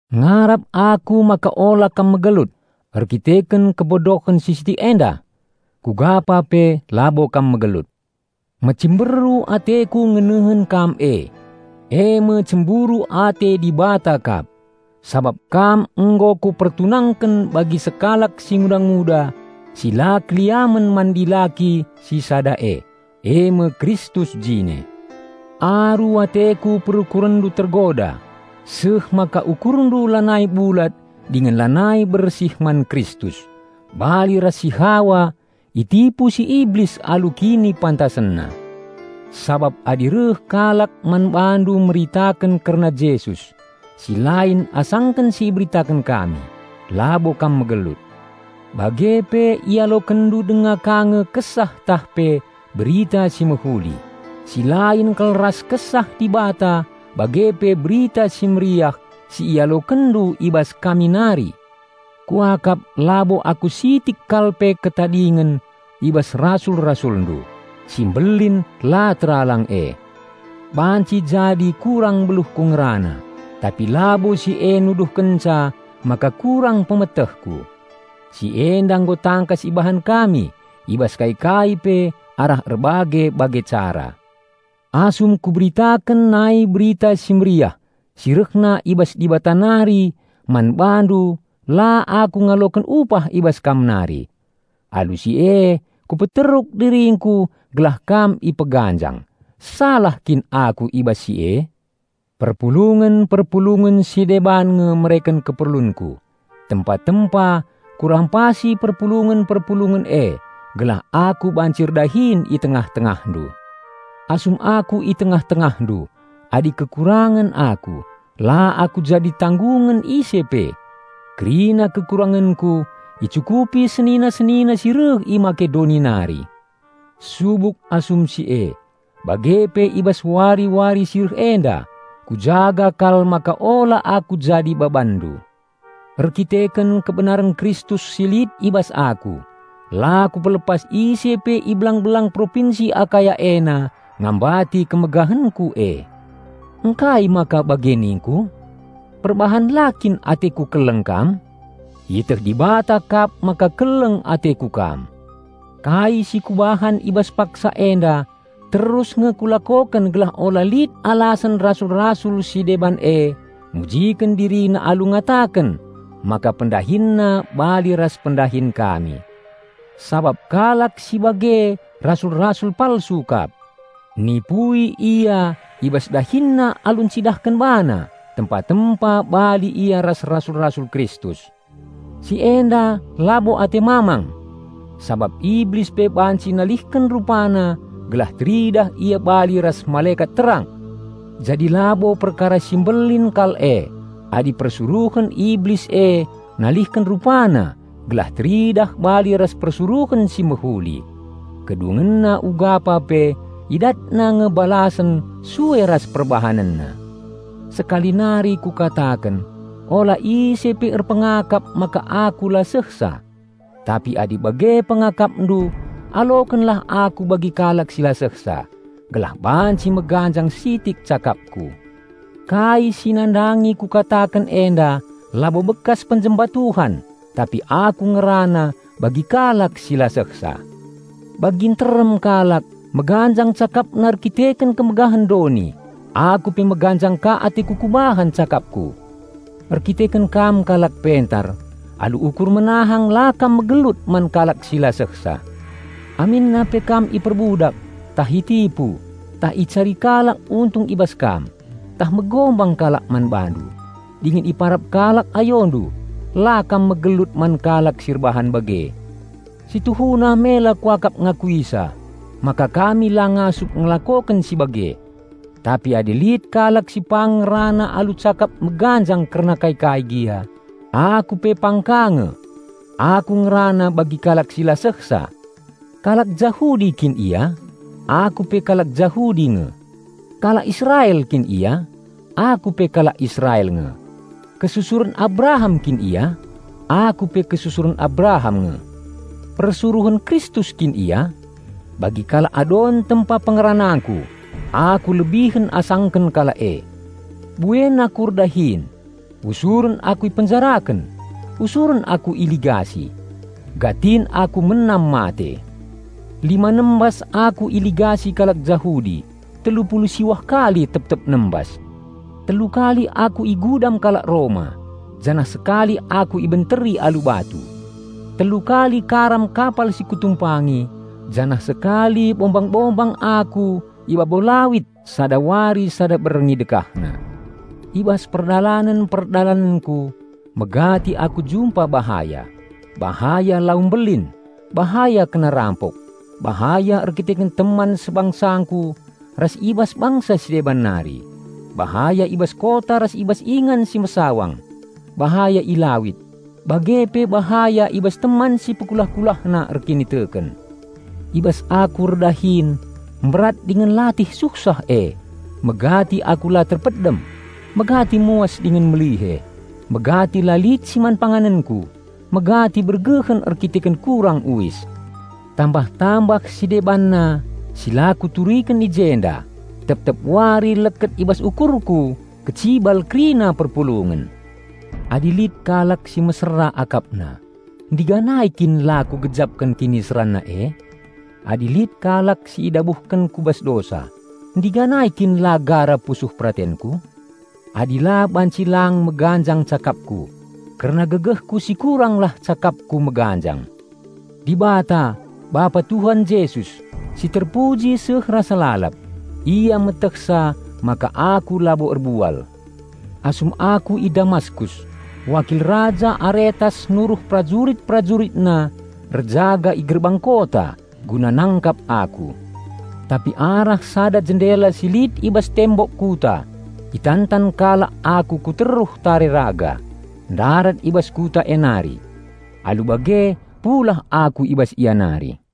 Ngarap aku maka ula kam megelut erkiteken kebodohen si sitik enda! Kugapa pe labo kam megelut. Mecimberu ateku ngenehen kam e, eme cemburu ate Dibata kap, sabap kam nggo kupertunangken bagi sekalak singuda-nguda si la keliamen man dilaki si Sada e, eme Kristus jine. Aru ateku perukurenndu tergoda, seh maka ukurndu lanai bulat dingen lanai bersih man Kristus, bali ras si Hawa itipu si Iblis alu kinipantasenna. Sabap adi reh kalak man bandu meritaken kerna "Jesus" si lain asangken si iberitaken kami, labo kam megelut. Bage pe ialokenndu denga ka nge kesah tah pe "berita si mehuli" si lain kal ras Kesah Dibata bage pe Berita Si Mehuli si ialokenndu i bas kami nari! Kuakap labo aku sitik kal pe ketadingen i bas rasul-rasulndu "si mbelin la teralang e". Banci jadi kurang beluhku ngerana, tapi labo si e nuduhkenca maka kurang pemetehku. Si enda nggo tangkas ibahan kami i bas kai-kai pe arah erbage-bage cara. Asum kuberitaken nai Berita Si Mehuli si rehna i bas Dibata nari man bandu la aku ngaloken upah i bas kam nari. Alu si e kupeteruk diringku gelah kam ipeganjang. Salah kin aku i bas si e? Perpulungen-perpulungen si deban nge mereken keperlunku; tempa-tempa kurampasi perpulungen-perpulungen e gelah aku banci erdahin i tengah-tengahndu. Asum aku i tengah-tengahndu, adi kekurangen aku, la aku jadi tanggungen ise pe. Kerina kekurangenku icukupi senina-senina si reh i Makedoni nari. Subuk asum si e, bage pe i bas wari-wari si reh enda kujaga kal maka ula aku jadi babanndu. Erkiteken kebenaren Kristus si lit i bas aku, la kupelepas ise pe i belang-belang propinsi Akaya ena ngambati kemegahenku e. Ngkai maka bage ningku? Perbahan la kin ateku keleng kam? Ieteh Dibata kap maka keleng ateku kam. Kai sikubahan i bas paksa enda terus nge kulakoken gelah ula lit alasen "rasul-rasul" si deban e mujiken dirina alu ngataken maka pendahinna bali ras pendahin kami. Sabap kalak si bage rasul-rasul palsu kap. Nipui ia i bas dahinna alu encidahken bana tempa-tempa bali ia ras rasul-rasul Kristus. Si enda labo ate mamang! Sabap Iblis pe banci nalihken rupana gelah teridah ia bali ras malekat terang! Jadi labo perkara si mbelin kal e adi persuruhen Iblis e nalihken rupana gelah teridah bali ras persuruhen si mehuli. Kedungenna ugapa pe idatna nge balasen sue ras perbahanenna. Sekali nari kukataken: ula ise pe erpengakap maka aku la sehsa. Tapi adi bage pengakapndu, alokenlah aku bagi kalak si la sehsa, gelah banci meganjang sitik cakapku. Kai si nandangi kukataken enda labo bekas penjemba Tuhan, tapi aku ngerana bagi kalak si la sehsa. Bagi nterem kalak meganjang cakapna erkiteken kemegahen doni, aku pe meganjang ka ateku kubahan cakapku. Erkiteken kam kalak pentar, alu ukur menahang la kam megelut man kalak si la sehsa. Aminna pe kam iperbudak, tah itipu, tah icari kalak untung i bas kam, tah megombang kalak man bandu, dingen iparap kalak ayondu, la kam megelut man kalak si erbahan bage. Si tuhuna mela kuakap ngakuisa, maka kami la ngasup ngelakoken si bage. Tapi adi lit kalak si pang ngerana alu cakap meganjang kerna kai-kai gia, aku pe pang ka nge. Aku ngerana bagi kalak si la sehsa. Kalak Jahudi kin ia? Aku pe kalak Jahudi nge. Kalak Israel kin ia? Aku pe kalak Israel nge. Kesusuren Abraham kin ia? Aku pe kesusuren Abraham nge. Persuruhen Kristus kin ia? Bagi kalak adon tempa pengeranangku -- aku lebihen asangken kalak e. Buen aku erdahin. Usuren aku ipenjaraken. Usuren aku iligasi. Gatin aku menam mate. Lima nembas aku iligasi kalak Jahudi; telu pulu siwah kali tep-tep nembas. Telu kali aku igudam kalak Roma janah sekali aku ibenteri alu batu. Telu kali karam kapal si kutumpangi, janah sekali bombang-bombang aku i babo lawit sada wari sada berngi dekahna. I bas perdalanen-perdalanenku, megati aku jumpa bahaya: bahaya lau mbelin, bahaya kena rampok, bahaya erkiteken teman sebangsangku ras i bas bangsa si deban nari, bahaya i bas kota ras i bas ingan si mesawang, bahaya i lawit, bage pe bahaya i bas teman si pekulah-kulahna erkiniteken. I bas aku erdahin mberat dingen latih suhsah e, megati aku la terpedem, megati muas dingen melihe; megati la lit si man panganenku, megati bergehen erkiteken kurang uis. Tambah-tambah si debanna si la kuturiken i jenda, tep-tep wari leket i bas ukurku kecibal kerina perpulungen. Adi lit kalak si mesera akapna, ndiganai kin la kugejapken kiniseranna e? Adi lit kalak si idabuhken ku bas dosa, ndiganai kin la gara pusuh peratenku? Adi la banci lang meganjang cakapku, kerna gegehku si kuranglah cakapku meganjang. Dibata, Bapa Tuhan Jesus, si terpuji seh rasa lalap, Ia metehsa maka aku labo erbual. Asum aku i Damaskus, wakil raja Aretas nuruh perajurit-perajuritna erjaga i gerbang kota guna nangkap aku. Tapi arah sada jendela si lit i bas tembok kuta itantan kalak aku ku teruh tare raga, ndarat i bas kuta e nari. Alu bage pulah aku i bas ia nari.